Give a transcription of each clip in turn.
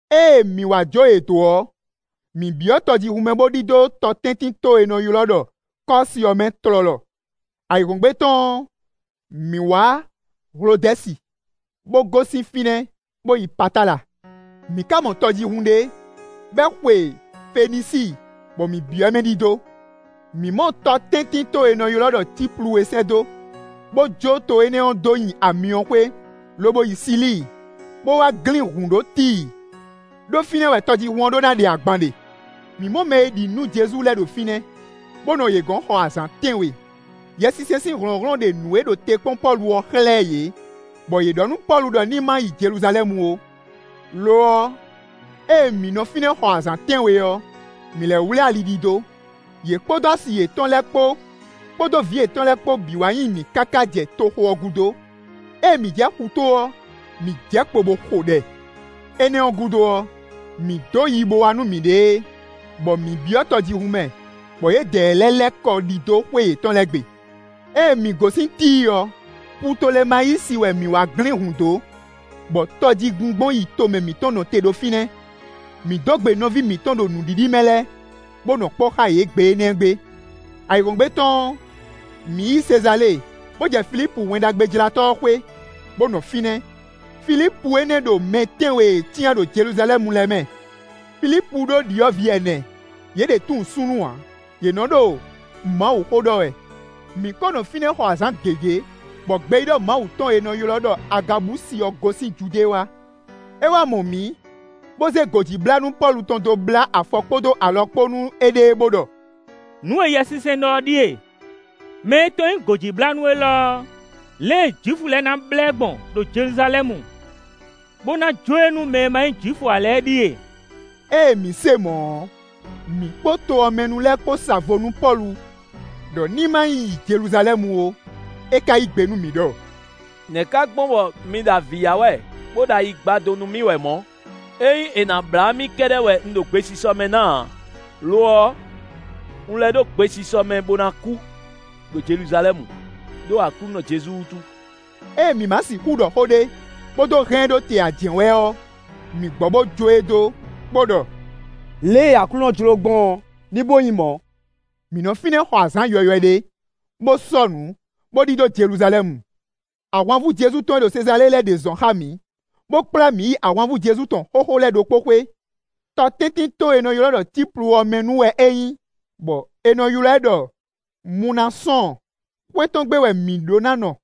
Ée mǐ wá jó yě dó ɔ́, mǐ byɔ́ tɔjíhún mɛ bo ɖidó tɔtɛ́ntinto e è nɔ ylɔ́ ɖɔ Kɔ́si ɔ́ mɛ tlɔlɔ. Ayǐhɔ́ngbe tɔn ɔ́, mǐ wǎ Hlodɛ́si, bó gosín fínɛ́ bo yi Patala. Mǐ ka mɔ tɔjíhún ɖé, bɔ é xwe Fenisíi, bɔ mǐ byɔ́ mɛ ɖidó. Mǐ mɔ tɔtɛ́ntinto e è nɔ ylɔ́ ɖɔ Cíplu é sɛ́ dó, bó jó to énɛ́ ɔ́ dó nyi amyɔxwé, lobo yi Silíi; bó wá glín hǔn ɖó Tíi, ɖó fínɛ́ wɛ tɔjíhún ɔ́ ɖó ná ɖe agban ɖe. Mǐ mɔ mɛ e ɖi nǔ nú Jezu lɛ́ɛ ɖo fínɛ́, bó nɔ yě gɔ̌n xɔ azǎn tɛ́nwe. Yɛsinsɛn sín hlɔ̌nhlɔ́n ɖe nǔ e ɖo te kpɔ́n Pɔ́lu ɔ́ xlɛ́ yě, bɔ yě ɖɔ nú Pɔ́lu ɖɔ ní ma yi Jeluzalɛ́mu ó. Lo ɔ́, ée mǐ nɔ fínɛ́ xɔ azǎn tɛ́nwe ɔ́, mǐ lɛ́ wlí ali ɖidó; yě kpódó asi yětɔn lɛ́ɛ kpó, kpódó vǐ yětɔn lɛ́ɛ kpó bǐ wá nyi mǐ káká jɛ toxo ɔ́ gúdo. Ée mǐ jɛ xutó ɔ́, mǐ jɛ kpo bó xo ɖɛ. Énɛ́ ɔ́ gúdo ɔ́, mǐ dó yibowá nú mǐɖée, bɔ mǐ byɔ́ tɔjíhún mɛ, bɔ yědɛɛ lɛ́ɛ lɛ́ kɔ ɖidó xwé yětɔn lɛ́ɛ gbe. Ée mǐ gosín Tíi ɔ́, Putolemayísi wɛ mǐ wá glín hǔn dó, bɔ tɔjígbingbɔn yi tomɛ mǐtɔn nɔ te ɖo fínɛ́. Mǐ dó gbe nɔví mǐtɔn ɖo nǔɖiɖi mɛ lɛ́ɛ, bó nɔ kpɔ́ xá yě gbe énɛ́ gbe. Ayǐhɔ́ngbe tɔn ɔ́, mǐ yi Sezalée, bó jɛ Filípu Wɛn Ɖagbejlátɔ́ ɔ́ xwé, bó nɔ fínɛ́. Filípu énɛ́ ɖo mɛ tɛ́nwe e è cyán ɖo Jeluzalɛ́mu lɛ́ɛ mɛ. Filípu ɖó ɖyɔ̌vǐ ɛnɛ; yě ɖě tunwun súnnu ǎ; yě nɔ́ ɖo Mawuxó ɖɔ wɛ. Mǐ ko nɔ fínɛ́ xɔ azǎn gěgé, bɔ gbeyíɖɔ Mawu tɔn e è nɔ ylɔ́ ɖɔ Agabusi ɔ́ gosín Judée wá. É wá mɔ mǐ, bó zé gǒjíblánú Pɔ́lu tɔn dó blá afɔ kpódó alɔ kpán nú éɖée, bó ɖɔ: “Nǔ e Yɛsinsɛn ɖɔ ɔ́ ɖíe: mɛ e tɔn nyí gǒjíblánú élɔ́ ɔ́, lě e Jwifu lɛ́ɛ na blá ɛ gbɔn ɖo Jeluzalɛ́mu, bó ná jó e nú mɛ e ma nyí Jwifu ǎ lɛ́ɛ é ɖíe.” Ée mǐ se mɔ̌ ɔ́, mǐ kpó to ɔ́ mɛ nu lɛ́ɛ kpó sa vo nú Pɔ́lu ɖɔ ní ma yi Jeluzalɛ́mu ó. É ka yí gbe nú mǐ ɖɔ: “Nɛ̌ ka gbɔn bɔ mi ɖo avǐ ya wɛ bó ɖo ayi gba dó nú mì wɛ mɔ̌? Ényí è nǎ blá mì kɛ́ɖɛ́ wɛ un ɖo gbesisɔ mɛ ná ǎ; lo ɔ́, un lɛ́ ɖo gbesisɔ mɛ bo ná kú ɖo Jeluzalɛ́mu, ɖó Aklúnɔ Jezu wútu.” Ée mǐ má sixú ɖɔ xó ɖé, bó dó hɛn ɛ ɖó te ǎ jɛ́n wɛ ɔ́, mǐ gbɔ bo jó e dó, bó ɖɔ: “Lě e Aklúnɔ jló gbɔn ɔ́, ní bo nyí mɔ̌.” Mǐ nɔ fínɛ́ xɔ azǎn yɔywɛ ɖé, bó sɔ́nǔ, bó ɖidó Jeluzalɛ́mu. Ahwanvú Jezu tɔn e ɖo Sezalée lɛ́ɛ ɖě zɔn xá mǐ, bó kplá mǐ yi ahwanvú Jezu tɔn xóxó lɛ́ɛ ɖokpó xwé; tɔtɛ́ntinto e è nɔ ylɔ́ ɖɔ Cíplu ɔ́ mɛ nu wɛ é nyí, bɔ è nɔ ylɔ́ ɛ ɖɔ Munasɔ́ɔn; xwé tɔn gbe wɛ mǐ ɖó ná nɔ.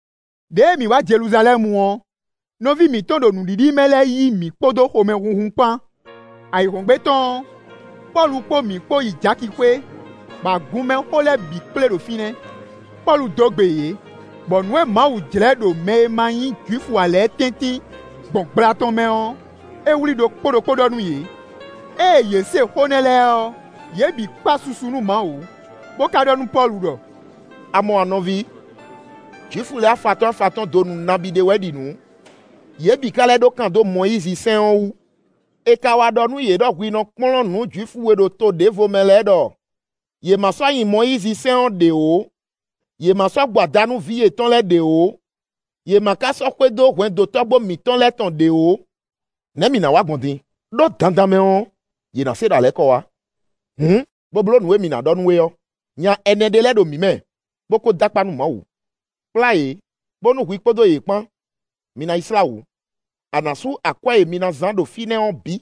Đěe mǐ wá Jeluzalɛ́mu ɔ́, nɔví mǐtɔn ɖo nǔɖiɖi mɛ lɛ́ɛ yí mǐ kpódó xomɛhunhun kpán. Ayǐhɔ́ngbe tɔn ɔ́, Pɔ́lu kpó mǐ kpó yi Jaki xwé, bɔ agunmɛxó lɛ́ɛ bǐ kplé ɖo fínɛ́. Pɔ́lu dó gbe yě, bɔ nǔ e Mawu jlɛ́ ɖo mɛ e ma nyí Jwifu ǎ lɛ́ɛ tɛ́ntin gbɔn gbla tɔn mɛ ɔ́, é wlí ɖokpó ɖokpó ɖɔ nú yě. Ée yě se xó nɛ́ lɛ́ɛ ɔ́, yě bǐ kpa susu nú Mawu, bó ka ɖɔ nú Pɔ́lu ɖɔ: “A mɔ a nɔví? Jwifu lɛ́ɛ afatɔ́n afatɔ́n donu nabí ɖé wɛ ɖi nǔ; yě bǐ ka lɛ́ ɖó kan dó Mɔyízi sɛ́n ɔ́ wú. È ka wá ɖɔ nú yě ɖɔ hwi nɔ kplɔ́n nǔ Jwifu e ɖo to ɖěvo mɛ lɛ́ɛ ɖɔ yě ma sɔ́ nyi Mɔyízisɛ́n ɔ́ ɖě ó; yě má sɔ́ gbo ada nú vǐ yětɔn lɛ́ɛ ɖě ó, yě ma ka sɔ́ xwedó hwɛndo tɔ́gbó mǐtɔn lɛ́ɛ tɔn ɖě ó. Nɛ̌ mǐ ná wa gbɔn din? Đó dandan mɛ ɔ́, yě ná se ɖɔ a lɛ́ kɔ wá. Hǔn, bó bló nǔ e mǐ ná ɖɔ nú we ɔ́. Nya ɛnɛ ɖé lɛ́ɛ ɖo mǐ mɛ, bó ko dó akpá nú Mawu. Kplá yě, bónú hwi kpódó yě kpán mi ná yi slá wǔ; a nǎ sú akwɛ́ e mi ná zán ɖo fínɛ́ ɔ́ bǐ,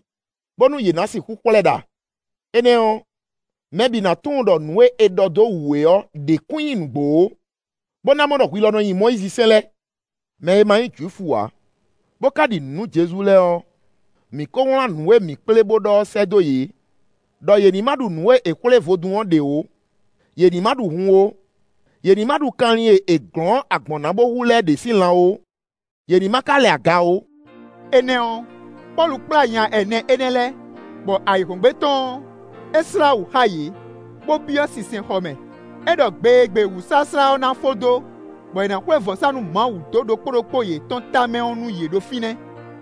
bónú yě ná sixú xwlɛ́ ɖa; énɛ́ ɔ́, mɛ bǐ ná tunwun ɖɔ nǔ e è ɖɔ dó wú we ɔ́ ɖě kún nyí nǔgbó ó, bó ná mɔ ɖɔ hwi lɔ nɔ nyi Mɔyízisɛ́n lɛ́ɛ. Mɛ e ma nyí Jwifu ǎ, bó ka ɖi nǔ nú Jezu lɛ́ɛ ɔ́, mǐ kó wlán nǔ e mǐ kplé bó ɖɔ ɔ́ sɛ́ dó yě ɖɔ yě ní má ɖu nǔ e è xwlé vodún ɔ́ ɖě ó; yě ní má ɖu hun ó; yě ní má ɖu kanlin e è glɔ̌n agbɔ̌n ná bo hu lɛ́ɛ ɖě sín lan ó, yě ní má ka lɛ aga ó.” Énɛ́ ɔ́, Pɔ́lu kplá nya ɛnɛ énɛ́ lɛ́ɛ, bɔ ayǐhɔ́ngbe tɔn ɔ́, é slá wǔ xá yě, bó byɔ́ sinsɛnxɔ mɛ. É ɖɔ gbe e gbe wǔsláslá ɔ́ ná fó dó, bɔ è nǎ xwlé vɔ̌sánú Mawu dó ɖokpó ɖokpó yětɔn tamɛ é nú yě ɖo fínɛ́.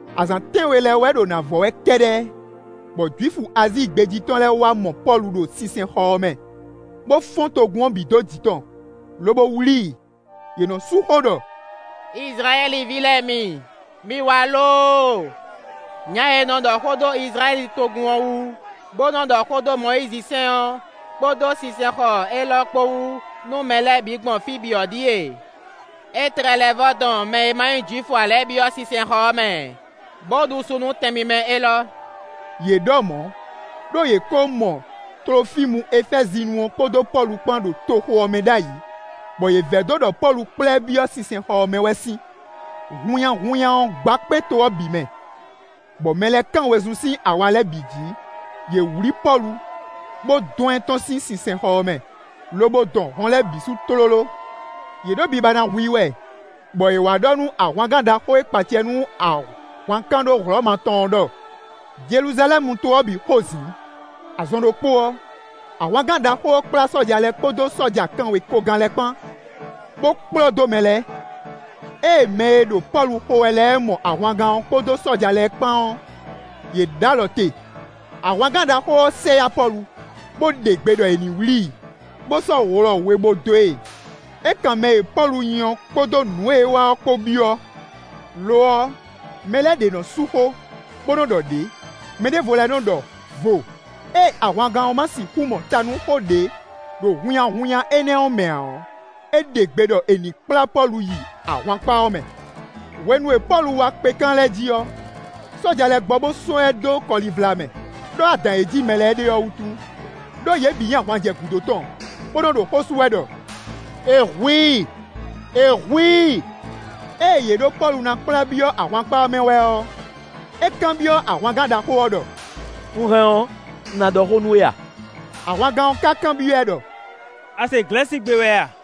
Azǎn tɛ́nwe lɛ́ɛ wɛ ɖo ná vɔ wɛ kɛ́ɖɛ́, bɔ Jwifu Azíi gbé jí tɔn lɛ́ɛ wá mɔ Pɔ́lu ɖo sinsɛnxɔ ɔ́ mɛ, bó fɔ́n togun ɔ́ bǐ dó jǐ tɔn, lobo wlí i. Yě nɔ́ sú xó ɖɔ: “Izlayɛ́li ví lɛ́ɛ mi, mi wá lóóo! Nya e nɔ ɖɔ xó dó Izlayɛ́li togun ɔ́ wú, bó nɔ́ ɖɔ xó dó Mɔyízi sɛ́n ɔ́, kpódó sinsɛnxɔ élɔ́ kpó wú nú mɛ lɛ́ɛ bǐ gbɔn fí bǐ ɔ́ ɖíe! É tlɛ lɛ́ vɔ́ dɔn mɛ e ma nyí Jwifu ǎ lɛ́ɛ byɔ́ sinsɛnxɔ mɛ, bó ɖu su nú tɛn mímɛ́ élɔ́.” (Yě ɖɔ mɔ̌, ɖó yě ko mɔ Tlofímu Efɛ́zinu ɔ́ kpódó Pɔ́lu kpán ɖo toxo ɔ́ mɛ ɖ'ayǐ, bɔ yě vɛdó ɖɔ Pɔ́lu kplá ɛ byɔ́ sinsɛnxɔ ɔ́ mɛ wɛ sín.) Hunnyahunnya ɔ́ gba kpé to ɔ́ bǐ mɛ, bɔ mɛ lɛ́ɛ kán wezun sín awa lɛ́ɛ bǐ jǐ; yě wlǐ Pɔ́lu, bó dɔn ɛ tɔ́n sín sinsɛnxɔ ɔ́ mɛ, lobo dɔn hɔn lɛ́ɛ bǐ sú tlóló. Yě ɖo biba ná hu i wɛ, bɔ è wá ɖɔ nú ahwangán ɖaxó e kpa acɛ nú ahwankánɖó Hlɔ̌ma tɔn ɔ́ ɖɔ: “Jeluzalɛ́mu to ɔ́ bǐ xo zǐn.” Azɔn ɖokpó ɔ́, ahwangán ɖaxó ɔ́ kplá sɔ́ja lɛ́ɛ kpódó sɔ́ja kanwekogán lɛ́ɛ kpán, bó kplɔ́ dó mɛ lɛ́ɛ. Ée mɛ e ɖo Pɔ́lu xo wɛ lɛ́ɛ mɔ ahwangán ɔ́ kpódó sɔ́ja lɛ́ɛ kpán ɔ́, yě ɖó alɔ te. Ahwangán ɖaxó ɔ́ sɛ yá Pɔ́lu, bó ɖe gbe ɖɔ è ní wlǐ i, bó sɔ́ wlɔ we bó dó e; é kan mɛ e Pɔ́lu nyí ɔ́ kpódó nǔ e é wa ɔ́ kpó byɔ́. Lo ɔ́, mɛ lɛ́ɛ ɖě nɔ́ sú xó, bó nɔ́ ɖɔ ɖě, mɛ ɖěvo lɛ́ɛ nɔ́ ɖɔ vo. Ée ahwangán ɔ́ má sixú mɔ ta nú xó ɖé ɖo hunnyahunnya énɛ́ ɔ́ mɛ ǎ ɔ́, é ɖe gbe ɖɔ è nǐ kplá Pɔ́lu yi ahwankpá ɔ́ mɛ. Hwenu e Pɔ́lu wá kpekán lɛ́ɛ jí ɔ́, sɔ́ja lɛ́ɛ gbɔ bó sɔ́ ɛ dó kɔlivla mɛ, ɖó adǎn e jí mɛ lɛ́ɛ ɖe ɔ́ wútu, ɖó yě bǐ nyi ahwan jɛ gǔdo tɔn, bó nɔ́ ɖo xó sú wɛ ɖɔ: “È hu i, è hu i!” Ée yě ɖo Pɔ́lu ná kplá byɔ́ ahwankpá ɔ́ mɛ wɛ ɔ́, é kanbyɔ́ ahwangán ɖaxó ɔ́ ɖɔ: “Un hɛn ɔ́, un ná ɖɔ xó nú we a?” Ahwangán ɔ́ ka kanbyɔ́ ɛ ɖɔ: “A se Glɛ̌sigbe wɛ a?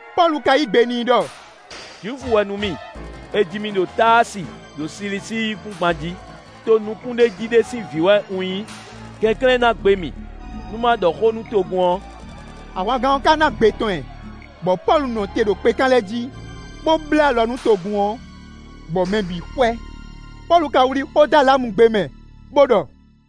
Pɔ́lu ka yí gbe n'i ɖɔ: “Jwifu wɛ nú mì; è ji mì ɖo Táasi ɖo Silisíi yíkúngban jí: to nukúnɖéjí ɖé sín vǐ wɛ un nyí; kɛnklɛ́n ná gbe mì, nú má ɖɔ xó nú togun ɔ́.” Ahwangán ɔ́ ka ná gbe tɔn ɛ, bɔ Pɔ́lu nɔ te ɖo kpekán lɛ́ɛ jí, bó bló alɔ nú togun ɔ́, bɔ mɛ bǐ xwɛ. Pɔ́lu ka wlí xó dó alamugbe mɛ, bó ɖɔ: